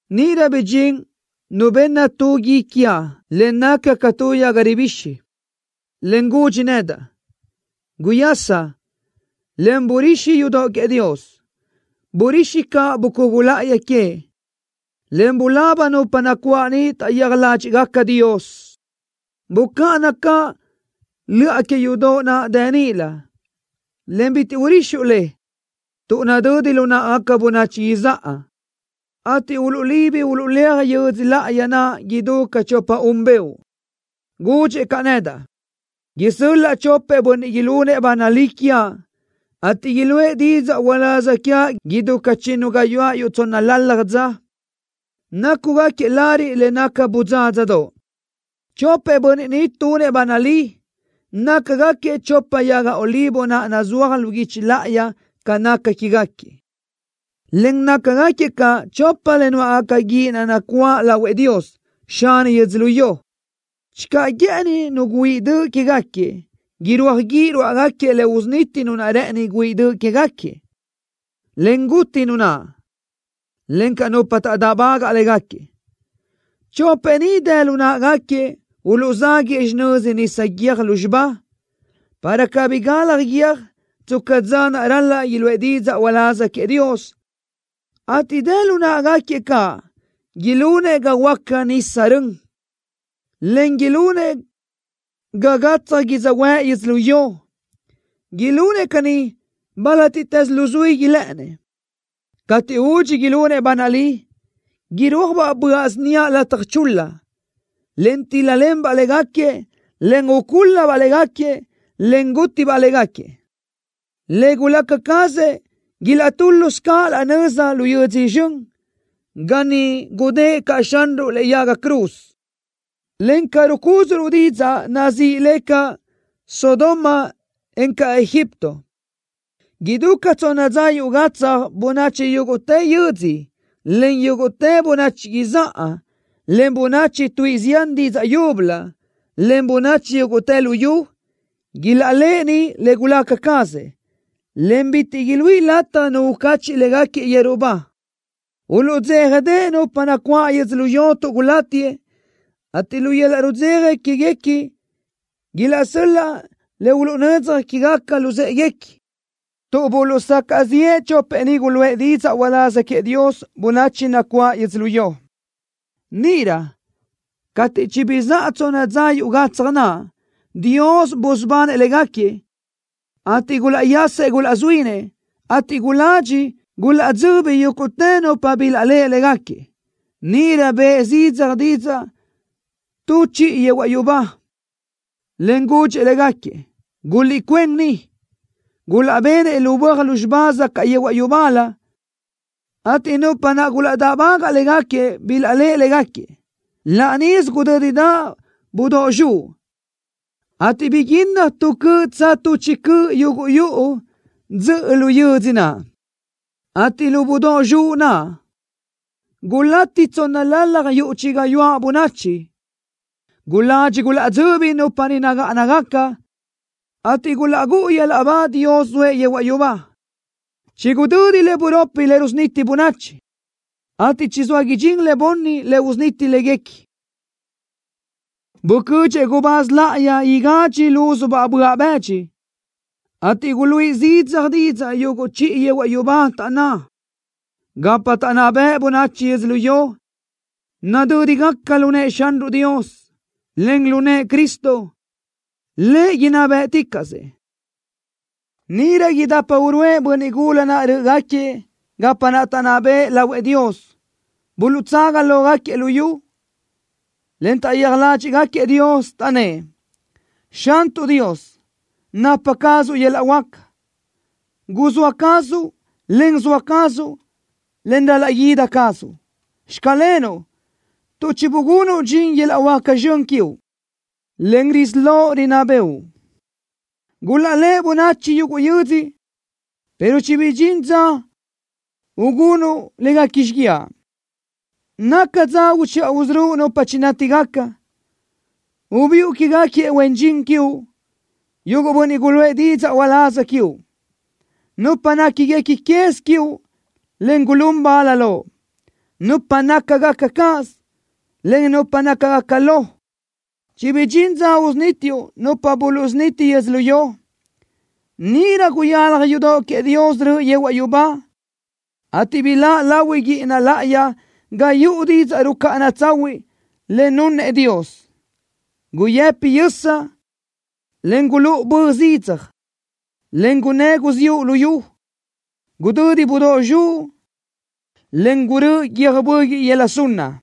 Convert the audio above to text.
Níʼirö bidxín nu benna tu gui quiaʼ le naca ca tu yaga ribixi, en gudxi nedaʼ: “Guyasa, en burixi yudoʼ queëʼ Dios. Burixi caʼ bucugu láʼayi que, en bulaba nupa nacuáʼ niʼ taʼyéaj ládxiʼgaca Dios. Bucáʼana caʼ löʼa que yudoʼ naʼ dë níʼilö, en bitiʼ urixuʼ le, tuʼ nadödi lu náʼagaca bönachi izáʼa, ateʼ uluʼlibi uluʼléaj yödzö láʼayi naʼ idú ca chopa-un beoʼ.” Gudxëʼ caʼ nedaʼ: “Isö́l-laʼa chopëʼ bönniʼ ilunëʼ ba nalí quiaʼ, ateʼ iluʼë didzaʼ uláz quiaʼ idú ca chinnu gayuáʼ yuʼ tsónnalalaj dza, nácugaquiëʼ lariʼ le naca bödzádzadoʼ.” Chopëʼ bönniʼ ni tunëʼ ba nalí, nácagaquiëʼ chopa yaga olivo naʼ nazúaj lu guichi láʼayi ca naca quégaquiëʼ, en nácagaquiëʼ caʼ chopa le nuáʼgaca guíʼ naʼ nacuáʼ lahuëʼ Dios, Xani yödzölió. Channö guë́ʼëni nu guáʼ döʼ quégaquiëʼ, irúaj guíʼ ruáʼagaquiëʼ le usuniti nu naʼ rë́ʼëni guáʼ döʼ quégaquiëʼ, en guti nu naʼ, encaʼ nupa taʼdáʼbagaʼ légaquiëʼ. Chopëʼ ni dë lu náʼagaquiëʼ uluʼzáguëʼë xinöza nisa guiö́j lúzxiba, para cabí galaj guiö́j tsca dza naʼ ral-laʼ iluʼë didzaʼ uláz queëʼ Dios, ateʼ dë lu náʼagaquiëʼ caʼ ilunëʼ ga huöáca nisa rön, en ilunëʼ ga gatsaj yödzöhuë́ʼ yödzölió. Ilunëʼ caní bálatiʼtës luzuí ilë́ʼënnëʼ. Cateʼ údxi ilunëʼ ba nalí, irúajbaʼ böaʼ síniaʼ lataj chul-la, en tíl-lalenbaʼ légaquiëʼ, en ucúl-labaʼ légaquiëʼ, en gútibaʼ légaquiëʼ. Le gulaca cazëʼ ilaʼtúlusö caʼ laʼ nöza lu yödzö zxön, ga niʼ gudë́ʼë caʼ Xanruʼ lëʼe yaga cruz, en ca rucúdzuʼruʼ didzaʼ, nazíʼi le caʼ Sodoma, encaʼ Egipto. Idú ca tsonna dza yuʼ gatsaj bönachi yúguʼtë yödzö, en yúguʼtë bönachi izáʼa, en bönachi tuíʼi zián didzaʼ yúbölö, en bönachi yúguʼtë luyú, ilaʼléʼeni le gulaca cazëʼ, en bitiʼ iluíʼ lataj nu ucacheʼ légaquiëʼ yeru ba. Uluʼdzéjadeʼe nupa nacuáʼ yödzölió tuʼ gulátiëʼ, ateʼ lu yöl-laʼ rudzeja quéguequi ilaʼsö́l-laʼ le uluʼnödzaj quégaca luzë́ʼeguequi, tuʼ buluʼsacaʼ ziʼë chopëʼ ni guluʼë didzaʼ uláz queëʼ Dios bönachi nacuáʼ yödzölió. Níʼirö cateʼ chibizáʼa tsonna dza yuʼ gatsaj naʼ, Dios busubanëʼ légaquiëʼ, ateʼ gulaʼyasëʼ gulazuínëʼ, ateʼ guladxi gulaʼdzöbi yúguʼtë nupa bilaʼléʼe légaquiëʼ. Níʼirö bëʼ zidzaj didzaʼ tu chiʼi yehuaʼ yubá, en gudxi légaquiëʼ: “Guliʼcuén ni.” Gulaʼbenëʼ lu böaj lúzxiba zacaʼ yehuaʼ yubálö, ateʼ nupa naʼ gulaʼdáʼbagaʼ légaquiëʼ bilaʼléʼe légaquiëʼ. Laʼ níʼisö gudö́didaʼ budóʼ zxuʼ, ateʼ biguinnaj tu cöʼ tsa tu chi cöʼ yuguʼ yuʼu dzöʼö lu yödzö naʼ, ateʼ lu budóʼ zxuʼ naʼ, gulati tsónnalalaj yuʼ chi gayuáʼ bönachi. Guladxi gulaʼdzöbi nupa niʼ nagáʼanagaca, ateʼ gulaʼgúʼu yöl-laʼ ba Dios zoëʼ yehuaʼ yubá. Chigudödi le buropi le rusuniti bönachi, ateʼ chizóa idxín le bunni le usuniti léguequi. Bucödxëʼ gubáz láʼayi igadxi lúzubaʼ böaʼ bëdxi, ateʼ guluíʼi zidzaj didzaʼ yuguʼ chiʼi yehuaʼ yubá, taʼnná: Gapa taʼnná bëʼ bönachi yödzölió nadö́digaca lu nëʼë Xanruʼ Dios, en lu nëʼë Cristo. Lëʼ inná bë́ʼticaʼsëʼ. Níʼirö idapa uruʼë bönniʼ gula naʼ rö́ʼögaquiëʼ gapa naʼ taʼnná bëʼë lahuëʼ Dios, buluʼtsaga lógaquiëʼ lu yu, en taʼyéaj ládxiʼgaquiëʼ Dios. Taʼnnë́ʼ: ¡Xantuʼ Dios, napa cazuʼ yöl-laʼ huáca! ¡Guzóa cazuʼ, en zoa cazuʼ, en ral-laʼ guída cazuʼ! ¡Xclenuʼ, tuʼ chibugunuʼ dxin yöl-laʼ huáca zxön quiuʼ, en risí loʼ rinná bëʼu! ¡Gulaʼlé bönachi yuguʼ yödzö pero chibidxín dza gunuʼ léguequi xíguiaʼ! ¡Naca dza uchiʼa usörö́uʼ nupa chinátigaca! ¡Ubiʼu quégaquiëʼ huen dxin quiuʼ, yuguʼ bönniʼ guluʼë didzaʼ uláz quiuʼ, nupa néquiguequi quez quiuʼ, en gulún bal Loʼ, nupa nácagaca cáʼasö, en nupa nácagaca lo! ¡Chibidxín dza usunítiuʼ nupa buluʼsuniti yödzölió! Níʼirö guyalaj yudoʼ queëʼ Dios röʼö yehuaʼ yubá, ateʼ biláʼ lahui guíʼina láʼayi ga yuʼu didzaʼ rucáʼana tsahuiʼ le nunëʼ Dios. Guyëpi yösa, en gulúʼu bö zidzaj, en gunnë́ guziúʼ luyú. Gudödi budóʼ zxuʼ, en gurö́ʼö guiö́j böguiʼ yöla sunna.